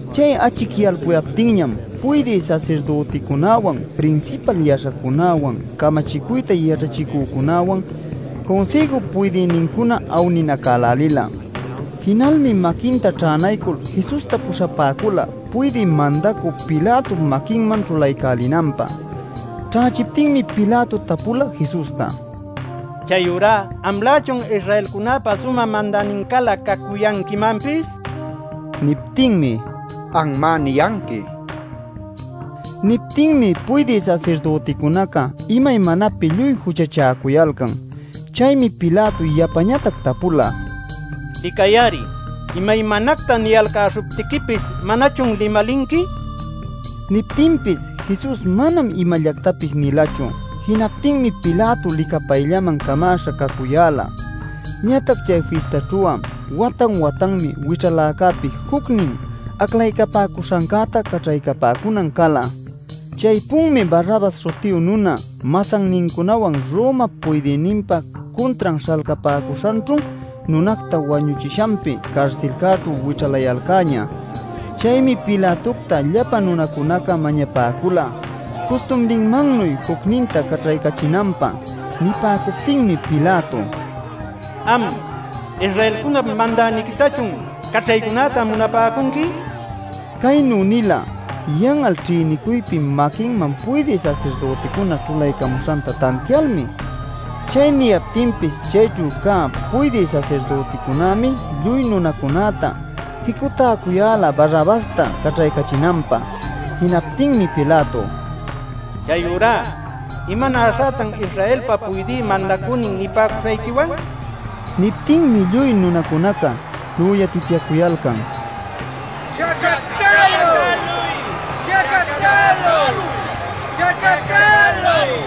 Chay achicyalpuyaptinñam puydï sasirdüticunäwan, prinsipal yaśhacunäwan, camachicuyta yaćhachicücunäwan Cunsïjup puydïnincuna awninacälälila. Jinalmi maquinta ćhänaycul Jesusta puśhapäcula puydï mandacü Pilatop maquinman ćhulaycälinanpä. Ćhächiptinmi Pilato tapula Jesusta: “¿Chayurá amlächun Israelcunäpa sumä mandänincälä cacuyanquimanpis?” nil. Niptinmi: “Anmá niyanqui” nin. Niptinmi puydï sasirdüticunaca imaymanapi lluy juchachäcuyalcan. Chaymi Pilato yapañatac tapula: “Licay-ari, imaymanacta niyalcäśhuptiquipis ¿manachun limalinqui?” nil. Niptinpis Jesus manam imallactapis nilachu. Jinaptinmi Pilato licapayllaman camäśha cacuyäla. Ñatac chay fistaćhu'a watan-watanmi wićhaläcäpi jucnin aclaycapäcuśhancäta caćhaycapäcunan cala. Chaypunmi Barrabas śhutiyu nuna masannincunawan Romap puydïninpa cuntran śhalcapäcuśhanćhu nunacta wañuchishanpi carsilcäćhu wićhalayalcäñä. Chaymi Pilatocta llapa nunacunaca mañapäcula custumrinmannuy jucninta caćhaycachinanpä. Nipäcuptinmi Pilato: “Am ¿Israelcunap mandäniquitachun caćhaycunäta munapäcunqui?” nila. Caynu nila yan'al ćhïnicuypi maquinman puydï sasirdüticuna ćhulaycamuśhanta tantialmi. Chay niyaptinpis chayćhu cä puydï sasirdüticunämi lluy nunacunäta jicutäcuyäla Barrabasta caćhaycachinanpä. Jinaptinmi Pilato: “Chayurá ¿imanäśhätan Israelpa puydï mandacünin nipäcuśhayquiwan?” nila. Niptinmi lluy nunacunaca lüyatityacuyalcan: “¡Chacatäluy! ¡Chacatäluy!” nil.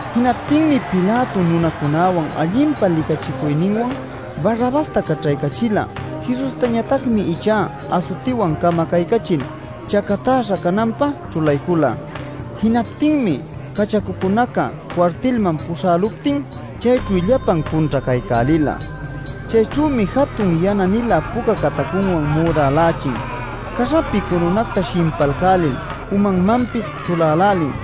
Jinaptinmi Pilato nunacunäwan allinpa licachicuyninwan Barrabasta caćhaycächila; Jesustañatacmi ichá asutiwan camacaycachil chacatäśha cananpä ćhulaycula. Jinaptinmi cachacucunaca cuartilman puśhäluptin chayćhu llapan cunćhacaycälila. Chayćhümi jatun yana-nilä puca catacunwan müdälächin; caśhapi curunacta shimpalcälil umanmanpis ćhulälälin.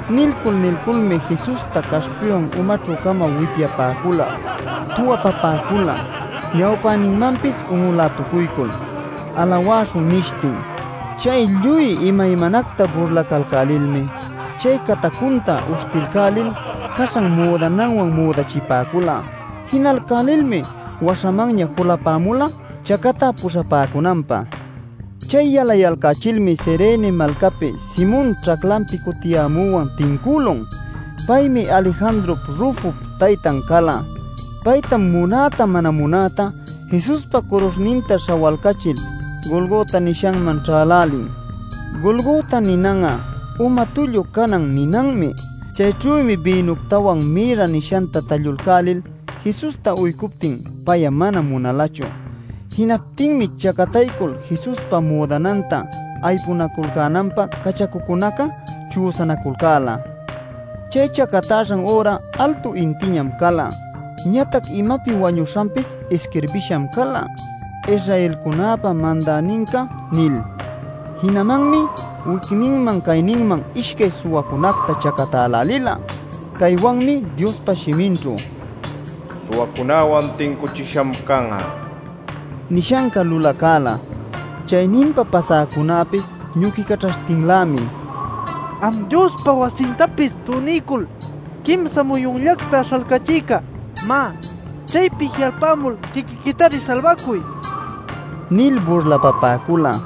Nilcul nilculmi, Jesusta caśhpiwan umaćhü-cama wipyapäcula, tuwapapäcula, ñawpäninmanpis un'ulätucuycul “alawäśhun” nishtin. Chay lluy imaymanacta burlacalcälilmi chay catacunta uśhtilcälil caśhan müdananwan müdachipäcula. Jinalcälilmi waśhamanña julapämula chacatä puśhapäcunanpä. Chay yalayalcächilmi Cirene malcapi Simon ćhaclanpi cutiyämüwan tincülun. (Paymi Alejandrop Rufop taytan cala.) Paytam munäta mana munäta Jesuspa curuśhninta śhawalcachil Golgota nishanman ćhälälin. (Golgota ninan'a uma tullu canan ninanmi.) Chayćhümi bïnuctawan mirra nishanta tallulcälil Jesusta uycuptin pay'a mana munalachu. Jinaptinmi chacataycul Jesuspa müdananta aypunaculcänanpä cachacucunaca chüsanaculcäla. Chay chacatäśhan üra altu intiñam cala. Ñatac imapi wañuśhanpis isquirbisham cala: “Israelcunäpa Mandäninca” nil. Jinamanmi wicninman cayninman ishcay suwacunacta chacatälälila. ˻ Caywanmi Diospa shiminćhu “Suwacunawan tincuchisham can'a” nishanca lulacäla.˼ Chayninpa pasäcunäpis ñuquicaćhaśhtinlämi: “Am Diospa wasintapis tunilcul quimsa muyunllacta śhalcachïca, má, chaypi ji'alpamul quiquiquitari salbacuy” nil burlapapäcula.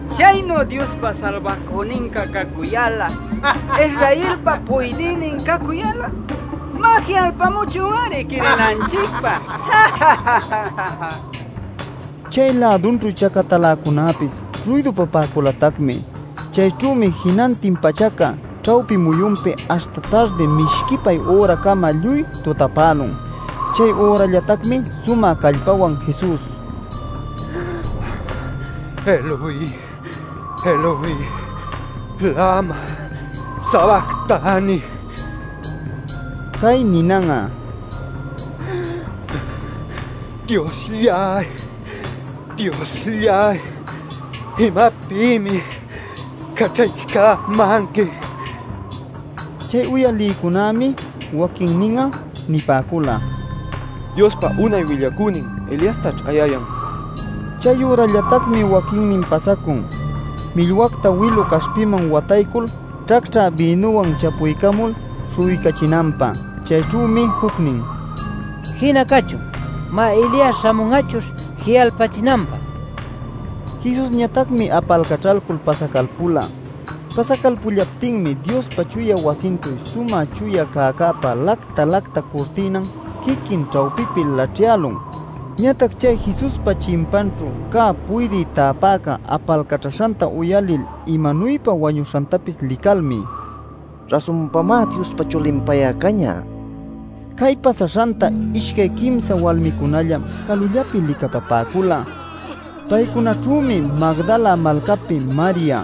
Chaynu Diospa Salbacüninca cacuyal'a, Israelpa puydïnin cacuyal'a, má, ji'alpamuchun-ari quirinanchicpä” nishtin. Chay-lädunćhu chacataläcunäpis ruydupapäculatacmi. Chayćhümi jinantin pachaca ćhawpi muyunpi aśhta tardi mishquipay üracama lluy tutapälun. Chay ürallatacmi sumä callpawan Jesus: “¡Eloi, Eloi, lama sabactani!” nila. (Cay ninan'a “Dioslláy, Dioslláy ¿imapïmi caćhaycämanqui?” ninanmi.) Chay uyalïcunämi waquinnin'a nipäcula: “Diospa unay willacünin Eliastaćh ayayan” nil. Chayürallatacmi waquinnin pasacun millwacta wilu caśhpiman wataycul ćhacćhä bïnuwan chapuycamul śhu'uycachinanpä. Chayćhümi jucnin “Jina cachun. Má, Elias śhamun'achuśh ji'alpachinanpä” nila. Jesusñatacmi apalcaćhalcul pasacalpula. Pasacalpullaptinmi Diospa chuya wasinćhu sumä chuya cäcäpa lacta-lacta curtïnan quiquin ćhawpipi laćhyälun. Ñatac chay Jesuspa chimpanćhu cä puydï täpäca apalcaćhaśhanta uyalil imanuypa wañuśhantapis licalmi: “Rasunpamá Diospa Chulin pay cañä” nila. Cay pasaśhanta ishcay quimsa walmicunallam calullapi licapapäcula. Paycunaćhümi Magdala malcapi Maria,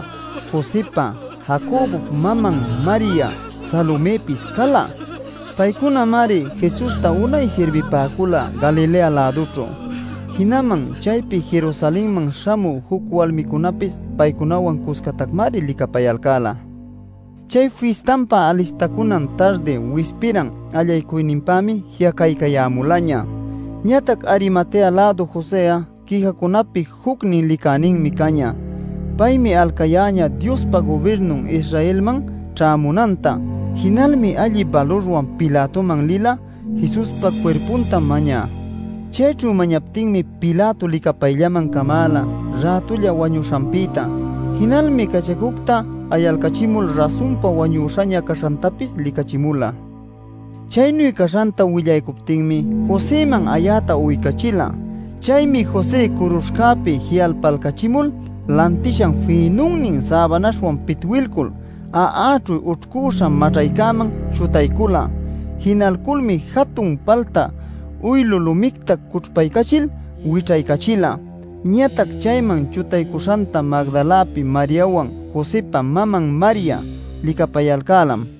Josëpa Jacobop maman Maria, Salomëpis cala. Paycunamari Jesusta unay sirbipäcula Galilea-lädućhu. Jinaman chaypi Jerusalenman śhamü juc walmicunapis paycunawan cuscatacmari licapayalcäla. Chay fistanpa alistacunan tardi wispiran allaycunanpämi ji'acaycayämulaña. Ñatac Arimatea-lädu Josë'a quijacunapi jucnin licäninmi cañä. Paymi alcayäñä Diospa gubirnun Israelman ćhämunanta. Jinalmi alli balurwan Pilatoman lila Jesuspa cuirpunta mañä. Chayćhu mañaptinmi Pilato licapayllaman camäla rätulla wañuśhanpïta. Jinalmi cachacucta ayalcachimul rasunpa wañüśhaña caśhantapis licachimula. Chaynu caśhanta willaycuptinmi Josëman ayäta uycachila. Chaymi José curuśhcäpi ji'alpalcachimul, lantishan fïnunnin säbanaśhwan pitwilcul a'aćhu ućhcüśha maćhayman chutaycula. Jinalculmi jatun palta uylu lumicta cućhpaycachil wićhaycachila. Ñatac chayman chutaycuśhanta Magdalapi Mariawan, Josëpa maman Maria licapayalcälam.